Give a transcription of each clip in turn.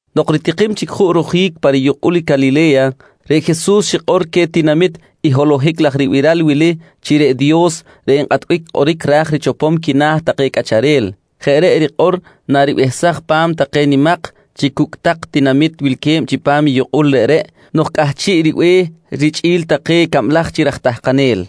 Nok ritikim chic juꞌ rojic pa riyukꞌul i Calile̱ya, reꞌ Jesus xikꞌor queh tinamit i holohic laj ribiral wili chi reꞌ Dios reꞌ nkꞌatbic kꞌoric ra̱j richopom quina̱ take cꞌacharel. Jeꞌ reꞌ rikꞌor naribehsaj pa̱m take nimak chi cucꞌ tak tinamit wilque̱b chipam i yukꞌul reꞌreꞌ nok cꞌahchiꞌ ribe̱h richꞌi̱l take cablaj chi raj tahkanel,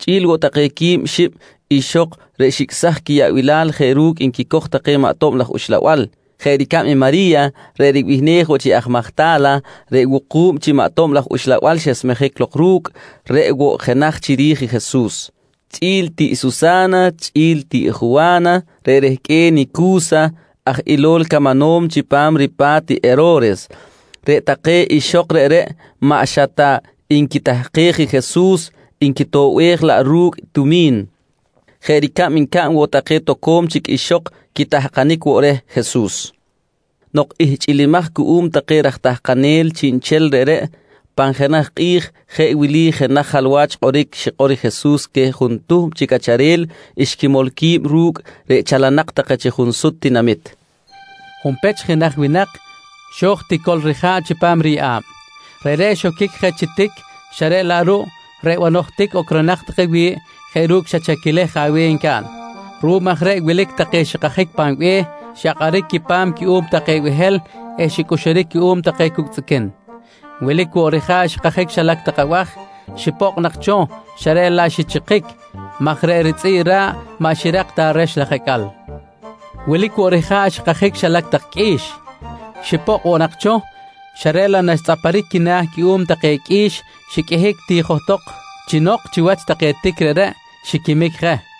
chꞌi̱l woꞌ take quib xib ixok reꞌ xicꞌsaj quiyaꞌbilal jeꞌ ru̱cꞌ nquicoj take maꞌ tob laj uxlabal. Jeꞌ ricab i Mari̱ya reꞌ ribihnej woꞌ chi aj Majta̱la, reꞌ wuku̱b chi maꞌ tob laj uxlabal xesmejic lok ru̱cꞌ, reꞌ woꞌ jenaj chiri̱j i Jesus, chꞌi̱l tiꞌ Susa̱na, chꞌi̱l tiꞌ Juwa̱na reꞌ rehqꞌue̱n i Cu̱sa aj ilol camanom chipam ripa̱t i Hero̱res. Reꞌ take ixok reꞌreꞌ maꞌ xa ta nquitahkej i Jesus, nquitoꞌbej laꞌ ru̱cꞌ tumi̱n, jeꞌ ricab ncaꞌn woꞌ take toco̱m chic ixok quitahkanic woꞌ reh Jesus. Nok ihchꞌilimaj cuꞌum take raj tahkanel chiꞌnchel reꞌreꞌ, pan jenaj kꞌi̱j jeꞌ wili jenaj jalwach kꞌoric xikꞌor Jesus queh juntuhm chi cꞌacharel xquimol qui̱b ru̱cꞌ reꞌ chalanak take chi sut tinamit: «Junpech jenaj winak xo̱j tico̱l rija̱ꞌ chipam riyeꞌa̱b. Reꞌreꞌ xoquic je chi tic xa reꞌ laꞌ ruꞌ reꞌ banoj tic ocronak take wi̱ꞌ jeꞌ ru̱cꞌ xa chaquilej je aweh ncaꞌn. Ruꞌum aj reꞌ wilic take xikajic pan be̱h, xyakꞌaric quipa̱m cuꞌum take behel eh xicꞌuxuric cuꞌum take cucꞌ tzꞌiquin. Wilic woꞌ rija̱ꞌ xikajic xilac tak abaj xipokꞌ nak cho xa reꞌ laꞌ xichikic maj reꞌ ritzꞌi̱ꞌ ra̱ꞌ maꞌ xirak ta rex laj acꞌal. Wilic woꞌ rija̱ꞌ xikajic xilac tak qꞌui̱x, xipokꞌ woꞌ nak cho xa reꞌ laꞌ naxtzꞌaparic quina̱ cuꞌum take qꞌui̱x xiqꞌuihic ti johtok chi nok chiwach take tic reꞌreꞌ, xiquimic je.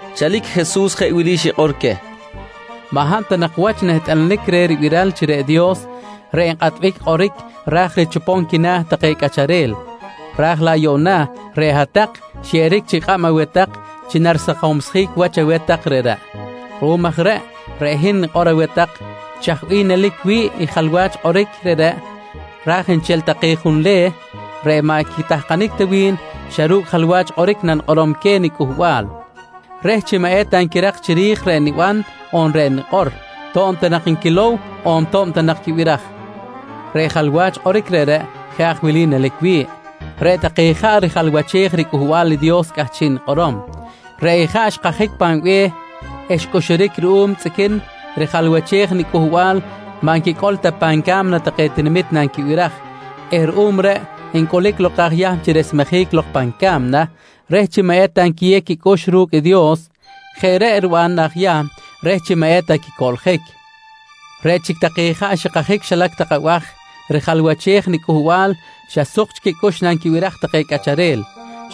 Chalic Jesus jeꞌ wili xikꞌor queh: «Maꞌ hab ta nak wach nehtꞌalanic reh ribiral chi reꞌ Dios reꞌ nkꞌatbic kꞌoric ra̱j richopom quina̱ take cꞌacharel, raj laꞌ yuꞌna reꞌ hat-tak xyeꞌeric chic kꞌab aweh tak chi narisakomjic wach aweh tak reꞌreꞌ. Ruꞌum aj reꞌ, reꞌ hin nanikꞌorom aweh tak chaj bih nelic wi̱ꞌ i jalwach kꞌoric reꞌreꞌ raj nchel take junleh reꞌ maꞌ quitahkanic ta wi̱n, xa ru̱cꞌ jalwach kꞌoric nanikꞌorom queh niCꞌuhbal reh chi maꞌ eta nquirak chiri̱j reꞌ niban on reꞌ nikꞌor, to̱b ta nak nquilow on to̱b ta nak quibiraj. Reꞌ jalwach kꞌoric reꞌreꞌ jeꞌ aj wili nelic wi̱ꞌ: Reꞌ take ijaꞌ rijalwachej riCꞌuhbal i Dios cꞌahchiꞌ nikꞌorom. Reꞌ ijaꞌ xkajic pan be̱h eh xcꞌuxuric ruꞌum tzꞌiquin rijalwachej i niCꞌuhbal maꞌ nquicꞌol ta pan ca̱mna take tinamit nanquibiraj eh ruꞌum reꞌ ncꞌulic lok aj Yahm chi resmejic lok pan ca̱mna reh chi maꞌ eta nquiyew quicꞌux ru̱cꞌ i Dios. Jeꞌ reꞌ riban aj Yahm reh chi maꞌ eta quicoꞌljic. «Reꞌ chic take ijaꞌ xikajic xilac tak abaj rijalwachej i niCꞌuhbal xa suk chic quicꞌux nanquibiraj take cꞌacharel,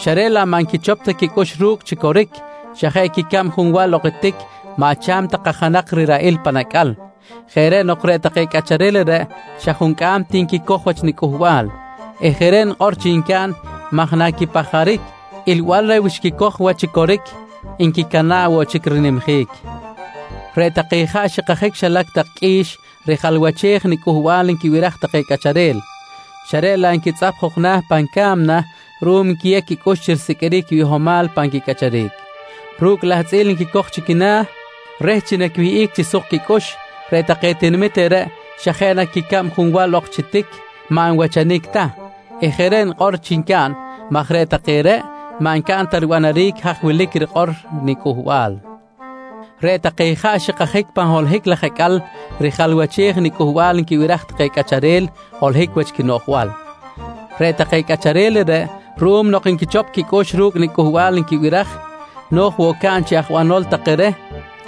xa reꞌ laꞌ maꞌ nquichop ta quicꞌux ru̱cꞌ chi coric, xa jeꞌ quicab junwal ok chi tic maꞌ cha̱m ta kajanak riraꞌil pan acꞌal. Jeꞌ reꞌ nok reꞌ take cꞌacharel reꞌreꞌ xa juncꞌam ti nquicoj wach niCꞌuhbal eh jeꞌ reꞌ nikꞌor chi ncaꞌn maj naquipajaric ilbal reh wi xquicoj wach chi coric, nquicana̱ꞌ woꞌ chic rinimjic. «Reꞌ take ijaꞌ xikajic xilac tak qꞌui̱x rijalwachej i niCꞌuhbal nquibiraj take cꞌacharel, xa reꞌ laꞌ nquitzꞌap jok na̱ pan ca̱mna ruꞌum nquiyew quicꞌux chi risiqꞌuiric quibihomal pan quicꞌacharic. Ru̱cꞌ lahtzꞌil nquicoj chi quina̱ reh chi naquiwihꞌic chi suk quicꞌux, reꞌ take tinamit reꞌreꞌ xa jeꞌ quicab junwal ok chi tic maꞌ nwachanic ta eh jeꞌ reꞌ nikꞌor chi ncaꞌn maj reꞌ take reꞌ maꞌ ncaꞌn ta ribanaric haj wilic rikꞌor niCꞌuhbal. Reꞌ take ijaꞌ xikajic pan holohic laj acꞌal rijalwachej i niCꞌuhbal nquibiraj take cꞌacharel holohic wach quinoꞌjbal. Reꞌ take cꞌacharel reꞌreꞌ ruꞌum nok nquichop quicꞌux ru̱cꞌ niCꞌuhbal nquibiraj, no̱j woꞌ caꞌn chi aj banol take reh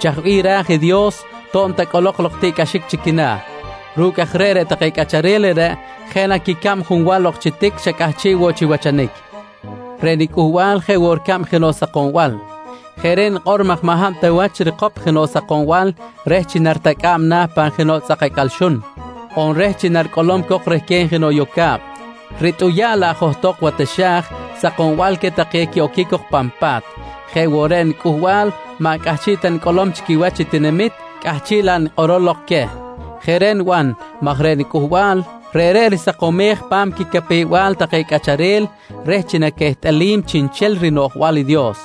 chaj bih ra̱j i Dios to̱b ta cꞌolok lok tiꞌcꞌaxic chi quina̱. Ru̱cꞌ aj reꞌ, reꞌ take cꞌacharel reꞌreꞌ jeꞌ na quicab junwal ok chi tic xa cꞌahchiꞌ woꞌ chi wachanic. «Reꞌ niCꞌuhbal jeꞌ woꞌ ricab jenoꞌ sakombal. Jeꞌ reꞌ nikꞌor maj maꞌ hab ta wach rikop jenoꞌ sakombal reh chi naritacꞌa̱b na̱ pan jenoꞌ tzꞌak acꞌal xun, on reh chi naricꞌolom cok rehquen jenoꞌ yoca̱b, ritꞌuya̱ꞌ laꞌ johtok wa taxa̱j sakombal queh take quiꞌoquic cok pan pa̱t. Jeꞌ woꞌ reꞌ niCꞌuhbal maꞌ cꞌahchiꞌ ta nicꞌolom chi quiwach i tinamit, cꞌahchiꞌ laꞌ nikꞌorom lok queh. Jeꞌ reꞌ niban maj reꞌ niCꞌuhbal, reꞌreꞌ risakomonej pa̱m quicapew-bal take cꞌacharel reh chi naquehtꞌalim chiꞌnchel rinoꞌjbal i Dios,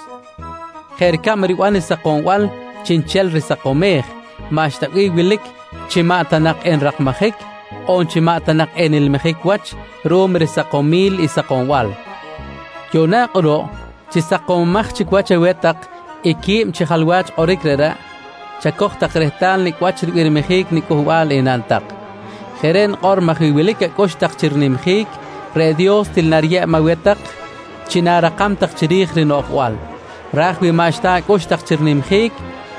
jeꞌ ricab riban i sakombal chiꞌnchel risakomej, maꞌxta bih wilic chi maꞌ ta nak enrakmajic, on chi maꞌ ta nak enilmijic wach ruꞌum risakomil i sakombal. «Yuꞌna kꞌuruꞌ chi sakomomaj chic wach aweh tak i qui̱b chi jalwach kꞌoric reꞌreꞌ, chacoj tak rehtal nicꞌ wach ribirmijic niCꞌuhbal enaꞌn tak. Jeꞌ reꞌ nikꞌor maj wi wilic acꞌux tak chi rinimjic, reꞌ Dios til nariyeb aweh tak chi na̱rakam tak chiri̱j rinoꞌjbal. Raj wi maꞌxta acꞌux tak chi rinimjic,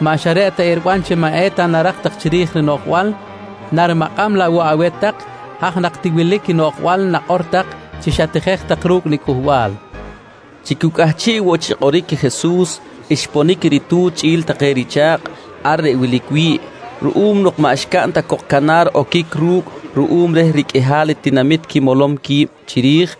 maꞌ xa reꞌ ta eriban chi maꞌ eta narak tak chiri̱j rinoꞌjbal, narimakꞌam laꞌ woꞌ aweh tak i haj nak ti wilic i noꞌjbal nakꞌor tak chi xatijej tak ru̱cꞌ niCꞌuhbal, nqui Jesus. Chi cu cꞌahchiꞌ woꞌ chi kꞌoric i Jesus, xponic i ritu̱t chꞌi̱l take richa̱kꞌ ar reꞌ wilic wi̱ꞌ. Ruꞌum nok maꞌ xcaꞌn ta cok canar oquic ru̱cꞌ ruꞌum reh riqꞌuihal i tinamit quimolom qui̱b chiri̱j,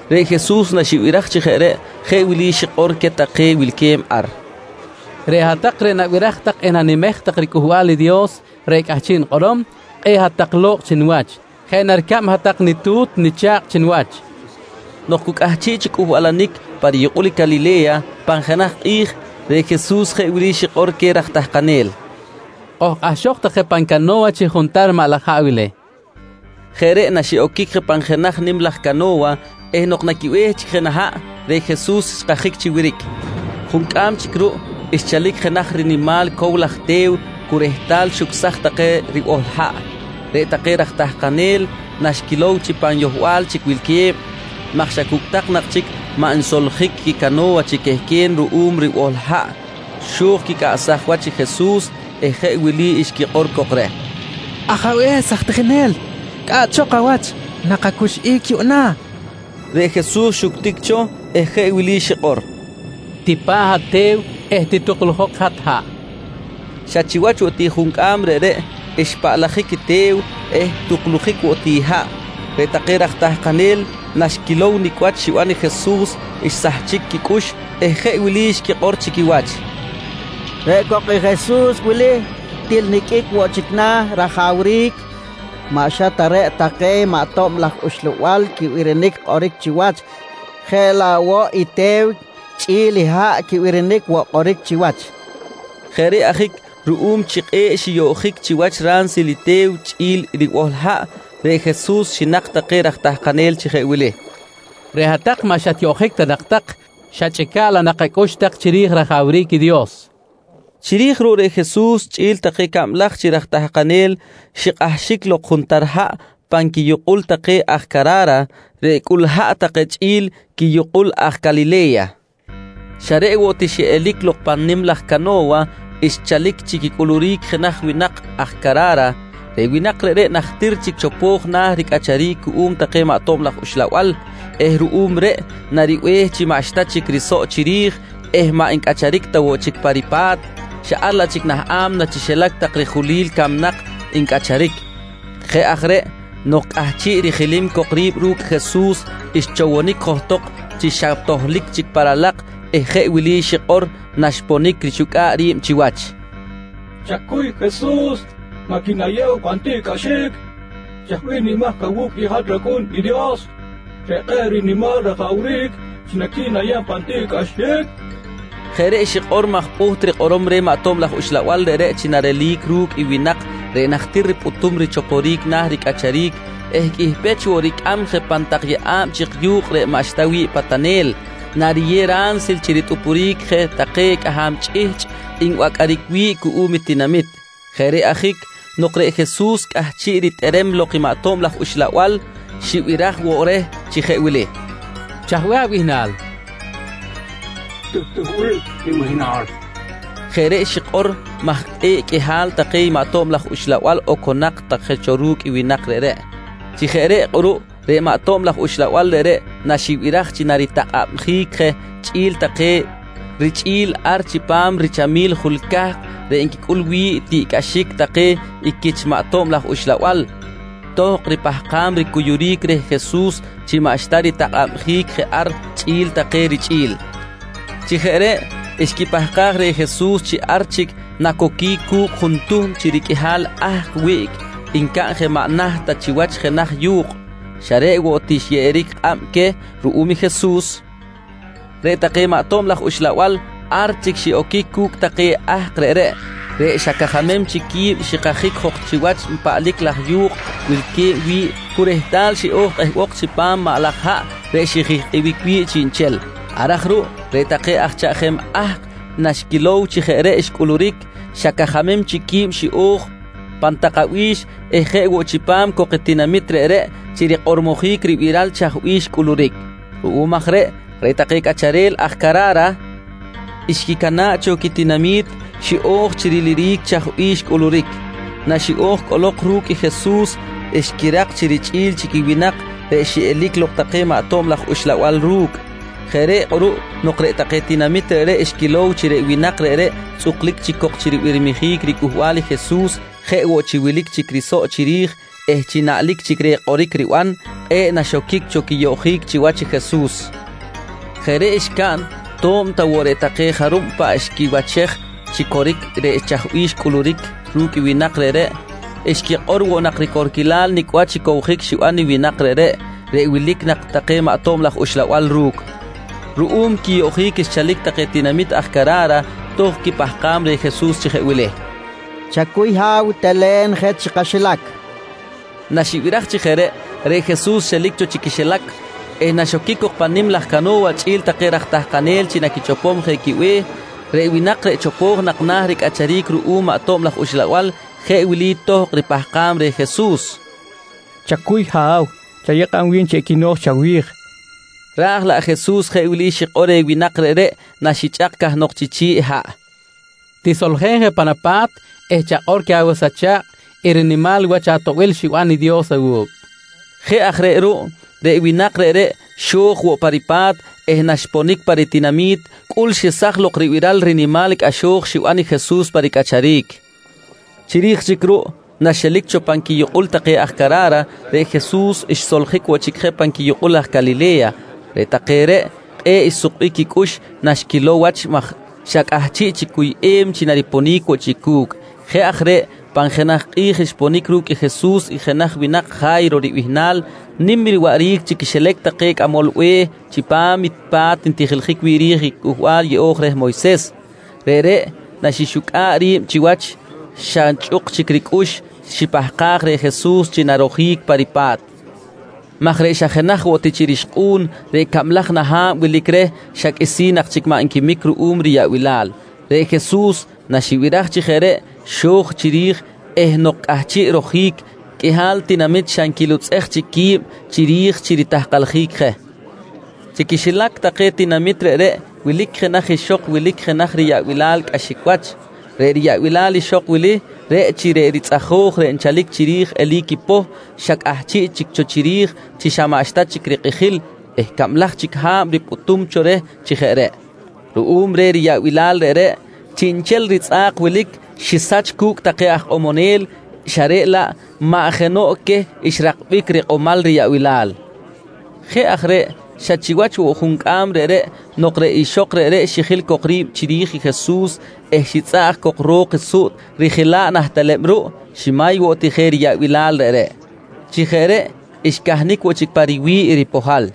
Reꞌ Jesus naxibiraj chi jeꞌ reꞌ, jeꞌ wili xikꞌor queh take wilque̱b ar: «Reꞌ hat-tak reꞌ nabiraj tak eh nanimej tak riCꞌuhbal i Dios reꞌ cꞌahchiꞌ nikꞌorom, kꞌe̱ꞌ hat-tak lo̱kꞌ chi niwach. Jeꞌ na ricab hat-tak nitu̱t nicha̱kꞌ chi niwach, nqui Jesus queh. Nok cu cꞌahchiꞌ chi cꞌuhbalanic pa riyukꞌul Calile̱ya, pan jenaj kꞌi̱j reꞌ Jesus jeꞌ wili xikꞌor queh raj tahkanel: «Kojkꞌahxok tak je pan cano̱wa chi juntar maꞌ laj haꞌ wili, nqui queh. Jeꞌ reꞌ naxiꞌoquic je pan jenaj nim laj cano̱wa eh nok naquibe̱h chic je nah haꞌ, reꞌ Jesus xkajic chi wiric. Juncꞌam chic ruꞌ, xchalic jenaj rinimal cow laj te̱w cu rehtal xucsaj take ribohl haꞌ. Reꞌ take raj tahkanel, naxquilow chi pan yohbal chic wilque̱b maj xa cucꞌ tak nak chic maꞌ nsoljic quicano̱wa chi quehqueh ruꞌum ribohl i haꞌ, xo̱j quicꞌaꞌsaj wach i Jesus eh jeꞌ wili xquikꞌor cok reh: «Ajabe̱s aj tijinel, cꞌaꞌchok awach! Nakacuxꞌic yuꞌna, nqui take reh. Reꞌ Jesus xuctic cho eh jeꞌ wili xikꞌor: «Tipa̱ꞌ hat te̱w eh tituklujok hat haꞌ, nqui xikꞌor. Xa chiwach woꞌ ti juncꞌam reꞌreꞌ xpaꞌlajic i te̱w eh tuklujic woꞌ ti i haꞌ. Reꞌ take raj tahkanel naxquilow nicꞌ wach xiban i Jesus, xsahchic quicꞌux eh jeꞌ wili xquikꞌor chi quiwach: «Reꞌ cok i Jesus wili til niqꞌuic woꞌ chic na̱ rajawric. Maꞌ xa ta reꞌ take maꞌ tob laj uxlabal quibirinic chiwach, jeꞌ laꞌ woꞌ i te̱w chꞌi̱l i haꞌ quibirinic woꞌ kꞌoric chiwach, nqui take. Jeꞌ reꞌ ajic ruꞌum chi kꞌe̱ꞌ xiyoꞌjic chiwach ransil i te̱w chꞌi̱l ribohl i haꞌ, reꞌ Jesus xinak take raj tahkanel chi jeꞌ wili: «Reꞌ hat-tak maꞌ xatyoꞌjic ta nak tak, xachꞌica̱ꞌ laꞌ nak acꞌux tak chiri̱j rajawric Dios, nqui queh. Chiri̱j ruꞌ reꞌ Jesus quichꞌi̱l take cablaj chi raj tahkanel xikꞌahxic lok juntar haꞌ pan quiyukꞌul take aj Cara̱ra reꞌ cꞌul haꞌ take chꞌi̱l quiyukꞌul aj Calile̱ya. Xa reꞌ woꞌ ti xiꞌelic lok pan nim laj cano̱wa xchalic chi quicꞌuluric jenaj winak aj Cara̱ra. Reꞌ winak reꞌreꞌ najtir chic chopo̱j na̱ ricꞌacharic cuꞌum take maꞌ tob laj uxlabal eh ruꞌum reꞌ naribe̱h chi maꞌxta chic risoꞌ chiri̱j eh maꞌ ncꞌacharic ta woꞌ chic pa ripa̱t, xa ar laꞌ chic nah a̱mna chi xilac tak rijulil camnak ncꞌacharic. Jeꞌ aj reꞌ nok cꞌahchiꞌ rijilim cok ri̱b ru̱cꞌ Jesus, xchowonic johtok chi xa tohlic chic pa ralak eh jeꞌ wili xikꞌor naxponic rixucꞌa̱ꞌ ri̱b chiwach: «Chacuy Jesus, maꞌ quinayew pan tiꞌcꞌaxic. Chaj bih nimahc awu̱cꞌ i hat rAcꞌu̱n i Dios reꞌ kꞌe̱ꞌ rinimal rajawric chi naquinayeb pan tiꞌcꞌaxic? nqui reh. Jeꞌ reꞌ xikꞌor maj pꞌuht rikꞌorom reh maꞌ tob laj uxlabal reꞌreꞌ chi narelic lok ru̱cꞌ i winak reꞌ najtir ripꞌutum cho richoporic na̱ ricꞌacharic eh qꞌuih pech woꞌ ricꞌam je pan tak yeꞌa̱b chik yu̱kꞌ reꞌ maꞌxta wi̱ꞌ patanel, nariyew ransil chi ritꞌupuric je take cꞌaham chꞌihchꞌ nbacꞌaric wi̱ꞌ cuꞌum i tinamit. Jeꞌ reꞌ ajic nok reꞌ Jesus cꞌahchiꞌ ritꞌerem lok i maꞌ tob laj uxlabal, xibiraj woꞌ reh chi jeꞌ wili: «Chaj bih abihnal? nqui reh. —Tuhbil nibihnal, nqui maꞌ tob laj uxlabal. Jeꞌ reꞌ xikꞌor maj kꞌe̱ꞌ qꞌuihal take chi maꞌ tob laj uxlabal oconak take cho ru̱cꞌ i winak reꞌreꞌ. Chi jeꞌ reꞌ kꞌuruꞌ reꞌ maꞌ tob laj uxlabal reꞌreꞌ naxibiraj chi naritakꞌabjic je chꞌi̱l take richꞌi̱l ar chipam richamil i jul cahk reꞌ nquicꞌul wi̱ꞌ tiꞌcꞌaxic take quich maꞌ tob laj uxlabal, tohkꞌ ripahkam ricuyuric reh Jesus chi maꞌxta ritakꞌabjic je ar chꞌi̱l take richꞌi̱l. Chi jeꞌ reꞌ xquipahkaj reh Jesus chi ar chic nacoquic cu̱cꞌ juntuhm chi riqꞌuihal ahk wiꞌc ncaꞌn je maꞌ naht ta chiwach jenaj yu̱kꞌ. Xa reꞌ woꞌ ti xyeꞌeric kꞌab queh ruꞌum Jesus, reꞌ take maꞌ tob laj uxlabal ar chic xiꞌoquic cu̱cꞌ take ahk reꞌreꞌ, reꞌ xa cajamem chic qui̱b xikajic jok chiwach paꞌlic laj yu̱kꞌ wilque̱b wi̱ꞌ cu rehtal xiꞌo̱j kꞌehbok chipam maꞌ laj haꞌ reꞌ xijihkꞌic wi̱ꞌ chiꞌnchel. Ar aj ruꞌ reꞌ take aj chaꞌjem ahk naxquilow chi jeꞌ reꞌ xcꞌuluric, xa cajamem chic qui̱b xiꞌo̱j pan tak abi̱x eh jeꞌ woꞌ chipam cok i tinamit reꞌreꞌ chi rikꞌormojic ribiral chaj bih xcꞌuluric. Ruꞌum aj reꞌ, reꞌ take cꞌacharel aj Cara̱ra xquicana̱ꞌ cho quitinami̱t, xiꞌo̱j chi riliric chaj bih xcꞌuluric. Naxiꞌo̱j cꞌolok ru̱cꞌ Jesus, xquirak chi richꞌi̱l chic i winak reꞌ xiꞌelic lok take maꞌ tob laj uxlabal ru̱cꞌ. Jeꞌ reꞌ kꞌuruꞌ nok reꞌ take tinamit reꞌreꞌ xquilow chi reꞌ winak reꞌreꞌ tzꞌuklic chic cok chi ribirmijic ricꞌuhbal i Jesus jeꞌ woꞌ chi wilic chic risoꞌ chiri̱j eh chi naꞌlic chic reh i kꞌoric riban, kꞌe̱ꞌ naxoquic cho quiyoꞌjic chiwach i Jesus. Jeꞌ reꞌ xcaꞌn to̱b ta woꞌ reꞌ take jarub paꞌ xquiwachej chi coric reꞌ chaj bih xcꞌuluric ru̱cꞌ i winak reꞌreꞌ, xquikꞌor woꞌ nak ricorquil nicꞌ wach i cowjic xiban i winak reꞌreꞌ, reꞌ wilic nak take maꞌ tob laj uxlabal ru̱cꞌ. Ruꞌum quiyoꞌjic xchalic take tinamit aj Cara̱ra, tohkꞌ quipahkam reh Jesus chi jeꞌ wili: «Chacuy Ha̱w, telen je chi kaxilac, nqui take reh. Naxibiraj chi jeꞌ reꞌ, reꞌ Jesus xelic cho chi quixilac eh naxoquic cok pan nim laj cano̱wa chꞌi̱l take raj tahkanel chi naquichopom je quibe̱h, reꞌ winak reꞌ chopo̱j nak na̱ ricꞌacharic ruꞌum maꞌ tob laj uxlabal, jeꞌ wili tohkꞌ ripahkam reh Jesus: «Chacuy ha̱w, chayew kꞌab wi̱n chi equino̱j chawi̱j, nqui reh. Raj laꞌ Jesus jeꞌ wili xikꞌor reh winak reꞌreꞌ, naxichꞌak cahnok chi chi̱ꞌ haꞌ: «Tisoljen je pan apa̱t eh chakꞌor queh awas acha̱kꞌ i rinimal wach atoꞌbil xiban i Dios awu̱cꞌ, nqui Jesus. Jeꞌ aj reꞌ ruꞌ reꞌ winak reꞌreꞌ xo̱j woꞌ pa ripa̱t eh naxponic pa ritinami̱t, cꞌul xesaj ribiral rinimal cꞌaxo̱j xiban i Jesus pa ricꞌacharic. Chiri̱j chic ruꞌ naxelic cho pan quiyukꞌul take aj Cara̱ra, reꞌ Jesus xsoljic woꞌ chic je pan quiyukꞌul aj Calile̱ya. Reꞌ take reꞌ kꞌe̱ꞌ xsukbic quicꞌux naxquilow wach maj xa cꞌahchiꞌ chic cuyꞌem chi nariponic woꞌ chic cu̱cꞌ. Jeꞌ aj reꞌ pan jenaj kꞌi̱j xponic ru̱cꞌ Jesus i jenaj winak Ja̱yro ribihnal nim riwaꞌric chi quixilac take cꞌamol be̱h chipam i pa̱t ntijiljic wi̱ꞌ ri̱j i Cꞌuhbal Yeꞌo̱j reh Moyses. Reꞌreꞌ naxixucꞌa̱ꞌ ri̱b chiwach, xa nchꞌuk chic ricꞌux xipahkaj reh Jesus chi narojic pa ripa̱t maj reꞌ xa jenaj woꞌ ti chi rixkꞌu̱n reꞌ cablaj na ha̱b wilic reh xa chic qꞌuisi̱n maꞌ nquimic ruꞌum riyaꞌbilal. Reꞌ Jesus naxibiraj chi jeꞌ reꞌ xo̱j chiri̱j eh nok cꞌahchiꞌ rojic, qꞌuihal tinamit xa nquilutzꞌej chic quib chiri̱j chi ritahkaljic je. Chi quixilac take tinamit reꞌreꞌ wilic jenaj ixok wilic jenaj riyaꞌbilal cꞌaxic wach. Reꞌ riyaꞌbilal ixok wili reꞌ chi reꞌ ritzꞌajo̱j reꞌ nchalic chiri̱j eli̱c poh xa cꞌahchiꞌ chic cho chiri̱j chi xa maꞌxta chic rikꞌijil eh cablaj chic ha̱b ripꞌutum cho reh chi jeꞌ reꞌ. Ruꞌum reh riyaꞌbilal reꞌreꞌ, chiꞌnchel i ritzꞌa̱k wilic xisach cu̱cꞌ take aj ikꞌomonel, xa reꞌ laꞌ maꞌ jenoꞌ queh xrakbic rikꞌomal riyaꞌbilal. Jeꞌ aj reꞌ, xa chiwach woꞌ i juncꞌam reꞌreꞌ nok reꞌ ixok reꞌreꞌ xijil cok ri̱b chiri̱j i Jesus eh xitzꞌaꞌj cok ro̱k i suꞌt rijela̱ꞌ nah teleb ruꞌ, ximay woꞌ ti je riyaꞌbilal reꞌreꞌ. Chi jeꞌ reꞌ xcahnic woꞌ chic pa riwi̱ꞌ i ripohal.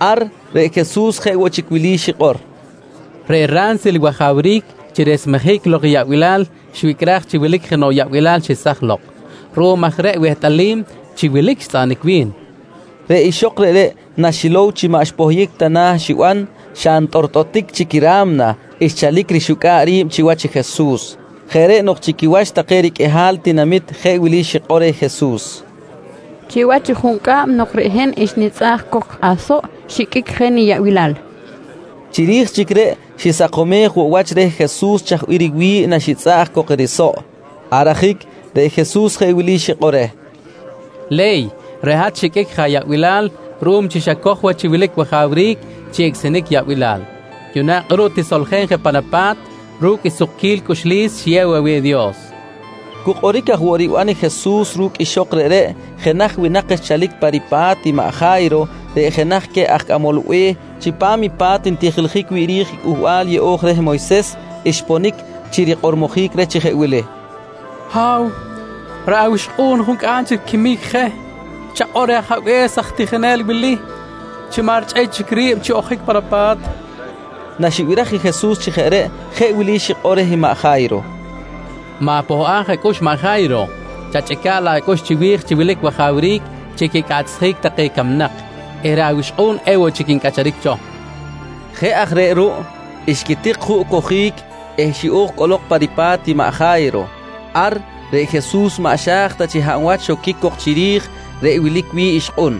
Ar reꞌ Jesus jeꞌ woꞌ chic wili xikꞌor: «Reꞌ ransil i wajawric chi resmejic lok yaꞌbilal xwicꞌraj chi wilic jenoꞌ yaꞌbilal xesaj lok. Ruꞌum aj reꞌ wehtꞌalim chi wilic xtzꞌaꞌanic wi̱n, nqui Jesus. Reꞌ ixok reꞌreꞌ naxilow chi maꞌ xpohyic ta na̱ i xiban, xa ntꞌortꞌotic chic i ra̱mna xchalic rixucꞌa̱ꞌ ri̱b chiwach i Jesus. Jeꞌ reꞌ nok chi quiwach take riqꞌuihal i tinamit jeꞌ wili xikꞌor reh Jesus: «Chiwach i juncꞌam nok reꞌ hin xnitzꞌaꞌj cok asoꞌ xiqꞌuic je niyaꞌbilal, nqui reh. Chiri̱j chic reꞌ xisakomej woꞌ wach reh Jesus chaj bih riwi̱ꞌ naxitzꞌaꞌj cok i risoꞌ. Ar ajic reꞌ Jesus jeꞌ wili xikꞌor reh: «Le̱y, reꞌ hat xiqꞌuic je ayaꞌbilal ruꞌum chi xacoj wach chi wilic wajawric chi icꞌsinic yaꞌbilal. Yuꞌna kꞌuruꞌ tisoljen je pan apa̱t ru̱cꞌ i sukquil cꞌuxlis xiyew aweh i Dios, nqui reh. Cu kꞌoric aj woꞌ riban i Jesus ru̱cꞌ ixok reꞌreꞌ, jenaj winak xchalic pa ripa̱t i maꞌ Ja̱yro reꞌ jenaj queh aj cꞌamol be̱h chipam i pa̱t ntijiljic wi̱ꞌ i Cꞌuhbal Yeꞌo̱j reh Moyses, xponic chi rikꞌormojic reh chi jeꞌ wili: «Ha̱w, reꞌ awixkꞌu̱n juncꞌam chic riquimic je. Chakꞌor reh ajabe̱s aj tijinel wili chi maꞌ richꞌey chic ri̱b chi ojic pan apa̱t, nqui reh. Naxibiraj i Jesus chi jeꞌ reꞌ, jeꞌ wili xikꞌor reh maꞌ Ja̱yro: «Ma̱pohꞌaj acꞌux maꞌ Ja̱yro. Chachꞌica̱ꞌ laꞌ acꞌux chiwi̱j chi wilic wajawric chi quicꞌaꞌchsjic take camnak eh reꞌ awixkꞌu̱n ewoꞌ chic ncꞌacharic cho, nqui reh. Jeꞌ aj reꞌ ruꞌ xquitik juꞌ cojic eh xiꞌo̱j cꞌolok pa ripa̱t i maꞌ Ja̱yro. Ar reꞌ Jesus maꞌ xa̱j ta chi hab wach xoquic cok chiri̱j reꞌ wilic wi̱ꞌ ixkꞌun,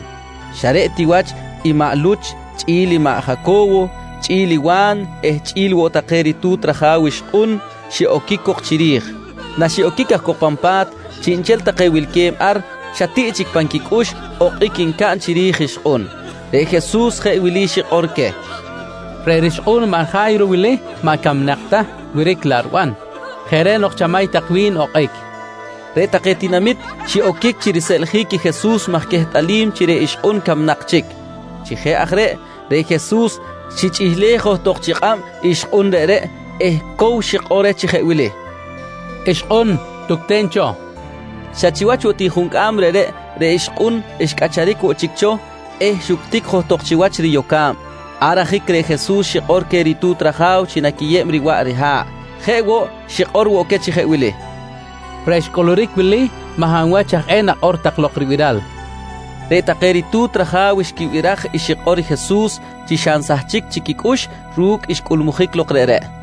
xa reꞌ ti wach i maꞌ Luch chꞌi̱l i maꞌ Jaco̱wo chꞌi̱l i Wa̱n eh chꞌi̱l woꞌ take ritu̱t raja̱w ixkꞌun xiꞌoquic cok chiri̱j. Naxiꞌoquic aj cok pan pa̱t, chiꞌnchel take wilque̱b ar xa tiꞌ chic pan quicꞌux okꞌic ncaꞌn chiri̱j ixkꞌun. Reꞌ Jesus jeꞌ wili xikꞌor queh: «Reꞌ rixkꞌu̱n maꞌ Ja̱yro wili maꞌ camnak ta wiric laꞌ riban. Jeꞌ reꞌ nok chamay tak wi̱n okꞌic, nqui queh. Reꞌ take tinamit xiꞌoquic chi riseꞌljic i Jesus maj quehtꞌalim chi reꞌ ixkꞌun camnak chic. Chi jeꞌ aj reꞌ, reꞌ Jesus xichꞌihlej johtok chi kꞌab ixkꞌun reꞌreꞌ eh cow xikꞌor reh chi jeꞌ wili: «Ixkꞌun, tucten cho, nqui reh. Xa chiwach woꞌ juncꞌam reꞌreꞌ, reꞌ ixkꞌun xcꞌacharic woꞌ chic cho eh xuctic johtok chiwach riyoca̱b. Ar ajic reꞌ Jesus xikꞌor queh ritu̱t raja̱w chi naquiyeb riwaꞌ riha̱ꞌ. Jeꞌ woꞌ, xikꞌor woꞌ queh chi jeꞌ wili: «Reꞌ xcꞌuluric wili maꞌ hab wach aj eh nakꞌor tak lok ribiral, nqui queh. Reꞌ take ritu̱t raja̱w xquibiraj i xikꞌor i Jesus chi xa nsahchic chic quicꞌux ru̱cꞌ xcꞌulmujic lok reꞌreꞌ.